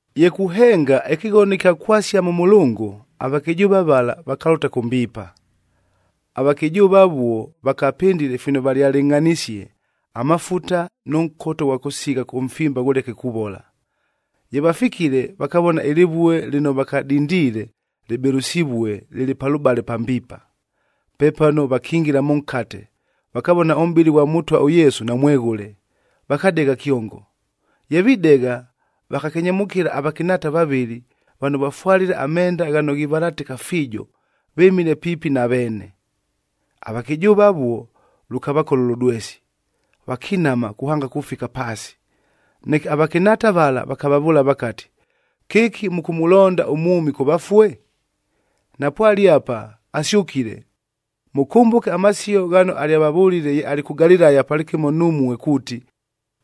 Ye kuhenga ɨkɨghono ɨkya kwasia mʉ mʉlʉngʉ, avakɨjʉʉva vala vakalʉta kʉ mbiipa. Avakɨjʉʉva avuo, vakapɨndile fino valyalɨngʼhanisie: amafuta nʉ nkota ʉghwa kʉsigha ʉmfimba ghʉleke kuvola. Ye vafikile, vakavona ɨlɨvue lɨno vakadindiile, lɨbɨlʉsivue lɨlɨ palʉbale pa mbiipa. Pepano, vakingila mʉnkate, vakavona ʉmʼbɨlɨ ghwa Mʉtwa ʉYesu, namweghʉle, vakadegha kyongo! Ye videgha, vakakenyemʉkɨla avakɨnhaata vavɨlɨ, vano vafwalile amenda ghano ghivalatɨka fiijo, vɨmile piipi na veene. Avakɨjʉʉva avuo, lʉkavakola ʉlʉdwesi. Vakinama kuhanga kufika paasi. Neke avakɨnhaata vala vakavavʉʉla vakati, “Kɨki mʉkʉmʉlonda ʉmwʉmi kʉ vafue? Napwale apa! Asyʉkile! Mʉkʉmbʉke amasio ghano alyavavʉlile ye alɨ kʉ Galilaya palɨkɨmo numue kuuti,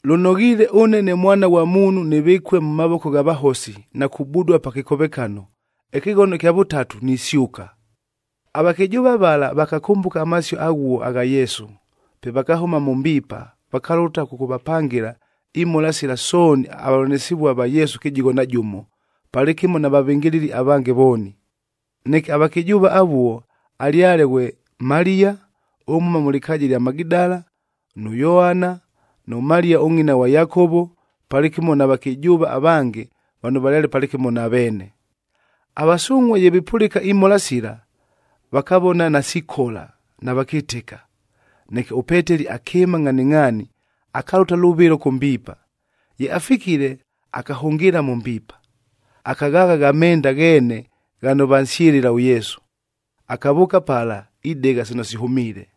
‘Lʉnoghiile ʉne ne Mwana ghwa Muunhu nɨvɨkue mʉ mavoko gha vahosi, na kubudua pa kɨkovekano, ɨkɨghono ɨkya vʉtatu nisyʉka’!” Avakɨjʉʉva vala, vakakʉmbʉka amasio aghuo agha Yesu. Pe vakahʉma mʉ mbiipa. Vakalʉta kʉkʉvapangɨla imhola sila sooni avavʉlanɨsɨvua va Yesu kɨjigho na jʉmo, palɨkɨmo na vavɨngɨlɨli avange vooni. Neke avakɨjʉʉva avuo alyale ghwe: Maliya ʉmhʉma mʉ lɨkaaja ɨlya Magidala, nʉ Yoana, nʉ Maliya ʉngʼina ghwa Yakovo, palɨkɨmo na vakɨjʉʉva avange vano valyale palɨkɨmo na veene. Avasungʼhuaa ye vipʉlɨka imhola sila, vakavona nasikola, navakɨtɨka. Neke ʉPeteli akɨɨma ngʼhaningʼhaani, akalʉta lʉvɨlo kʉ mbiipa. Ye afikile, akahʉngɨɨla mʉ mbiipa, akaghaagha gha menda gheene ghano vansyɨlɨla ʉYesu. Akavʉʉka pala, idegha sino sihʉmiile.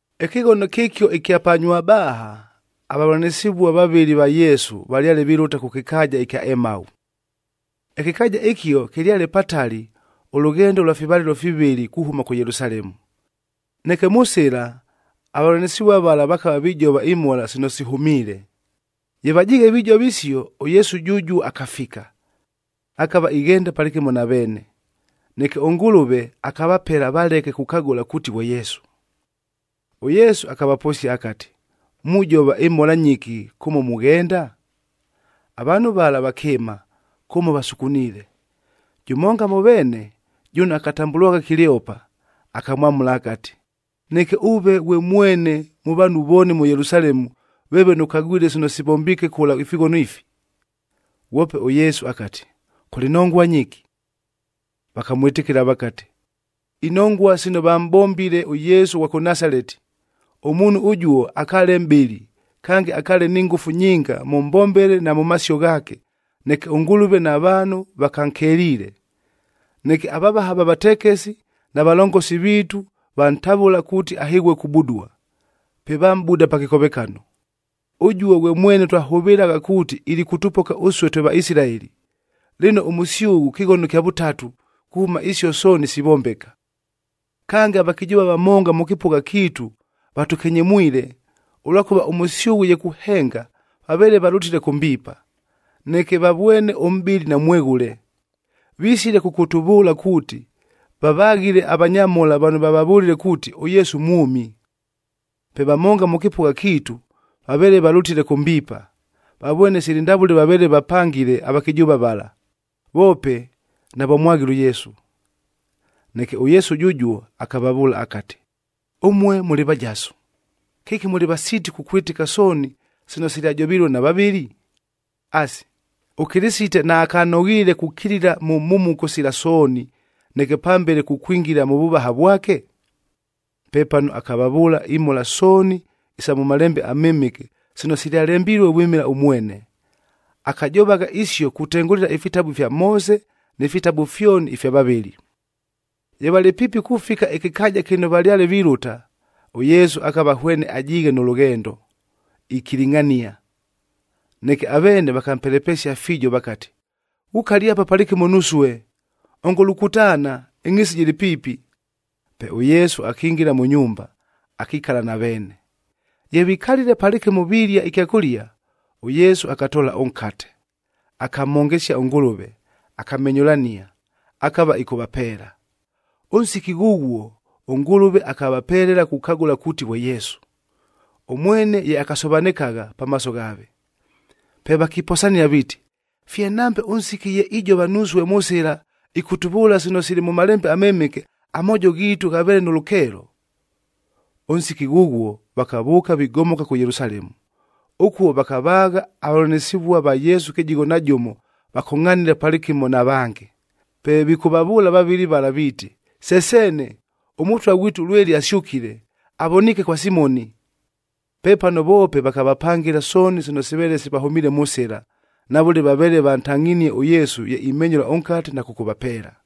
Ɨkɨghono kɨkio ɨkya pa Nywabaaha, avavʉlanɨsɨvua vavɨlɨ va Yesu valyale vilʉta kʉ kɨkaaja ɨkya Emau. Ɨkɨkaaja ɨkio, kɨlyale patali, ʉlʉghendo ʉlwa fivalɨlo fivɨlɨ kuhʉma kʉ Yelusalemu. Neke mʉ sɨla, avavʉlanɨsɨvua vala vakava vijova imhola sino sihʉmiile. Ye vajiighe vijova isio, ʉYesu jʉjuo akafika, akava ighenda palɨkɨmo na veene, neke ʉNgʉlʉve akavapela valeke kukagʉla kuuti ghwe Yesu. ɄYesu akavaposia akati, “Mujova ɨmhola nyɨki kʉmo mughenda?” Avaanhu vala vakɨɨma, kʉmo vasukuniile. Jʉmonga mʉ veene, jʉno akatambʉlwagha Kileopa, akamwamʉla akati, “Neke ʉve ghwe mwene mʉ vaanhu vooni mʉ Yelusalemu, veeve nʉkagwile sino sivombiike kʉla ifighono ifi?” Ghwope ʉYesu akati, “Kʉlɨ nongua nyɨki?” Vakamwɨtɨkɨla vakati, “Inongua sino vamʼbombile ʉYesu ʉghwa kʉ Nasaleti. Ʉmuunhu ʉjuo akaale mʼbɨli, kange akaale ni ngʉfu nyinga mʉ mbombele na mʉ masio ghaake, neke ʉNgʉlʉve na vaanhu vakankeliile. Neke avavaha va vatekesi, na valongosi viitu vantavʉla, kuuti ahɨghue kubudua. Pe vamʼbuda pa kɨkovekano. Ʉjuo ghwe mwene twahʉvɨlagha kuuti ilikʉtʉpoka ʉsue twe Vaisilaeli. Lɨno, ʉmʉsyʉghʉ kɨghono kya vʉtatu, kuhʉma isio sooni sivombeka. “Kange, avakɨjʉʉva vamonga mʉ kɨpʉgha kiitu vatʉkenyemwile, ʉlwakʉva ʉmʉsyʉghʉ ye kuhenga, vaveele valʉtile kʉ mbiipa, neke vavwene ʉmʼbɨlɨ namweghʉle. Visile kʉkʉtʉvʉʉla kuuti, vavaghile avanyamhola vano vavavʉlile kuuti ʉYesu mwʉmi. Pe vamonga mʉ kɨpʉgha kiitu vaveele valʉtile kʉ mbiipa, vavwene sili ndavʉle vaveele vapangile avakɨjʉʉva vala, voope navamwaghile ʉYesu.” Neke ʉYesu jʉjuo akavavʉʉla akati, “Ʉmue mʉlɨ vajasu! Kɨki mʉlɨ vasiiti kukwɨtɨka sooni sino silyajovilue na vavɨli! Asi, ʉKɨlɨsite naakanoghiile kukilila mʉ mhumuko sila sooni, neke pambele kukwingila mʉ vʉvaha vwake?” Pepano, akavavʉʉla imhola sooni isa mʉ Malembe aMɨmɨke, sino silyalembilue vwɨmɨla ʉmwene. Akajovagha isio kutengʉlɨla ifitabu ifya Moose ni fitabu fyoni ifya vavɨli. Ye valɨ piipi kufika ɨkɨkaaja kɨno valyale vilʉta, ʉYesu akava hwene ajiighe nʉ lʉghendo, ikilingʼhania. Neke aveene vakampelepesia fiijo vakati, “Ghukale apa palɨkɨmo nusue! Ongo lukutaana, ɨngʼhiisi jɨlɨ piipi.” Pe ʉYesu akingila mʉ nyumba, akikala na veene. Ye vikalile palɨkɨmo pilia ɨkyakʉlia, ʉYesu akatoola ʉnkate, akamhongesia ʉNgʉlʉve, akamenyʉlania, akava ɨkʉvapeela. Ʉnsiki ghʉghuo, ʉNgʉlʉve akavapelela kukagʉla kuuti ghwe Yesu, ʉmwene ye akasovanɨkagha pamaaso ghaave. Pe vakiposania viiti, “Fye nambe ʉnsiki ye ijova nusue mʉ sɨla, ɨkʉtʉvʉʉla sino sili mʉ Malembe aMɨmɨke, amoojo ghiitu ghaveele nʉ lʉkeelo!” Ʉnsiki ghʉghuo, vakavʉʉka vigomoka kʉ Yelusalemu. Ʉkuo vakavaagha avavʉlanɨsɨvua va Yesu kɨjigho na jʉmo vakongʼhanile palɨkɨmo na vange. Pe vikʉvavʉʉla vavɨlɨ vala viiti, “Se seene, ʉMʉtwa ghwitu lweli asyʉkile! Avoniike kwa Simoni!” Pepano voope vakavapangɨla sooni sino siveele sivahʉmiile mʉ sɨla, na vʉle vaveele vantangʼhinie ʉYesu ye imenyʉla ʉnkate na kʉkʉvapeela.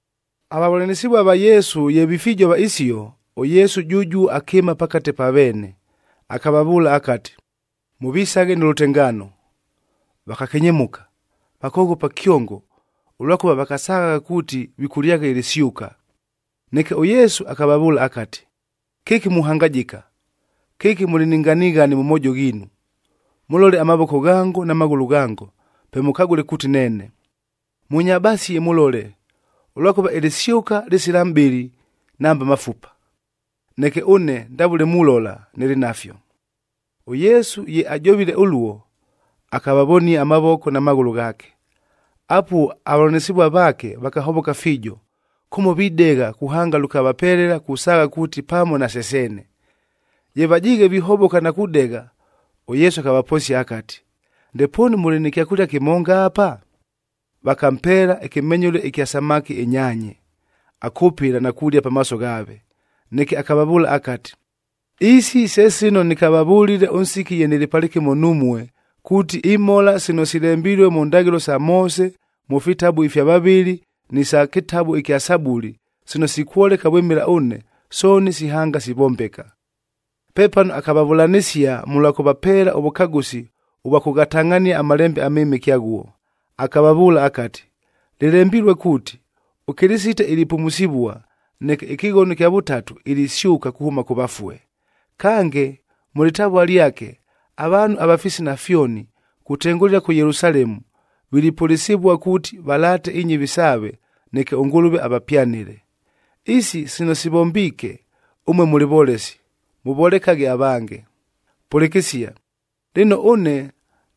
Avavʉlanɨsɨvua va Yesu ye vifijova isio, ʉYesu jʉjuo akɨɨma pakate pa veene. Akavavʉʉla akati, “Mʉvisaghe nʉ lʉtengaano!” Vakakenyemʉka, vakoghopa kyongo, ʉlwakʉva vakasaghagha kuuti vikʉlyagha ɨlɨsyʉka. Neke, ʉYesu akavavʉʉla akati, “Kɨki muhangajɨka! Kɨki mʉlɨ ni nganighani mʉ moojo ghiinu! Mʉlole amavoko ghango na maghʉlʉ ghango, pe mʉkagʉle kuuti neene. Mʉnyabasie mʉlole, ʉlwakʉva ɨlɨsyʉka lɨsila mʼbɨlɨ, nambe mafupa. Neke ʉne ndavʉle mulola, nɨlɨ nafyo.” ɄYesu ye ajovile ʉluo, akavavonia amavoko na maghʉlʉ ghaake. Apuo avavʉlanɨsɨvua vaake, vakahovoka fiijo, kʉmo videgha kuhanga lʉkavapelela kusaagha kuuti pamo nase seene! Ye vajiighe vihovoka na kudegha, ʉYesu akavaposia akati, “Ndepoonu mʉlɨ nɨ kyakʉlia kɨmonga apa?” Vakampeela ɨkɨmenyʉle ɨkya samaki ɨnyaanye. Akʉpɨla na kulia pamaaso ghaave. Neke akavavʉʉla akati, “Isi, se sino nɨkavavʉlile ʉnsiki ye nɨlɨ palɨkɨmo numue, kuuti imhola sino silembilue mʉ ndaghɨlo sa Moose, mʉ fitabu ifya vavɨli, ni sa kɨtabu kya Sabuli sino sikwoleka vwɨmɨla ʉne, sooni sihanga sivombeka.” Pepano akavavʉlanɨsia mʉlwa kʉvapeela ʉvʉkagʉsi ʉvwa kʉghatangʼhania aMalembe aMɨmɨke aghuo, akavavʉʉla akati, “Lɨlembilue kuuti, ʉKɨlɨsite ilipumusivua, neke ɨkɨghono ɨkya vʉtatu, ilisyʉka kuhʉma kʉ vafue. Kange mʉ lɨtavua lyake, avaanhu ava fisina fyoni, kutengʉlɨla kʉ Yelusalemu, vilipʉlɨsɨvua kuuti, valaate inyɨvi saave, neke ʉNgʉlʉve avapyanɨle. Isi sino sivombiike, ʉmue mʉlɨ volesi, mʉvolekaghe avange. “Pʉlɨkɨsia! Lɨno, ʉne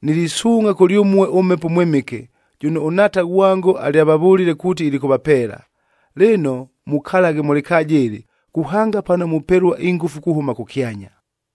nilisuungʼha kʉlyʉmue ʉMhepo ʉMwɨmɨke jʉno ʉNhaata ghwango alyavavʉlile kuuti ilikʉvapeela. Lɨno, mukalaghe mʉ lɨkaaja ɨlɨ,b kuhanga pano mupelua ingʉfu kuhʉma kʉkyanya.”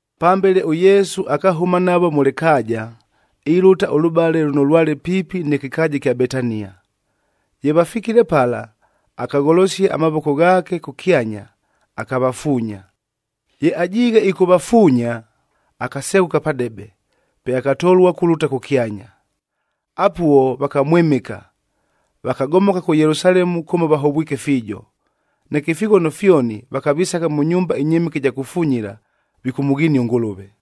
Pambele ʉYesu akahʉma navo mʉ lɨkaaja, ilʉta ʉlʉbale lʉno lwale piipi nɨ kɨkaaja ɨkya Betania. Ye vafikile pala, akagholosia amavoko ghaake kʉkyanya, akavafuunya. Ye ajiighe ɨkʉvafuunya, akaseghʉka padebe, pe akatolua kulʉta kʉkyanya. Apuo, vakamwɨmɨka. Vakagomoka kʉ Yelusalemu kʉmo vahovwike fiijo. Neke ifighono fyoni, vakavisagha mʉ nyumba ɨnyɨmɨke ɨja kufunyila, vikʉmʉghinia ʉNgʉlʉve.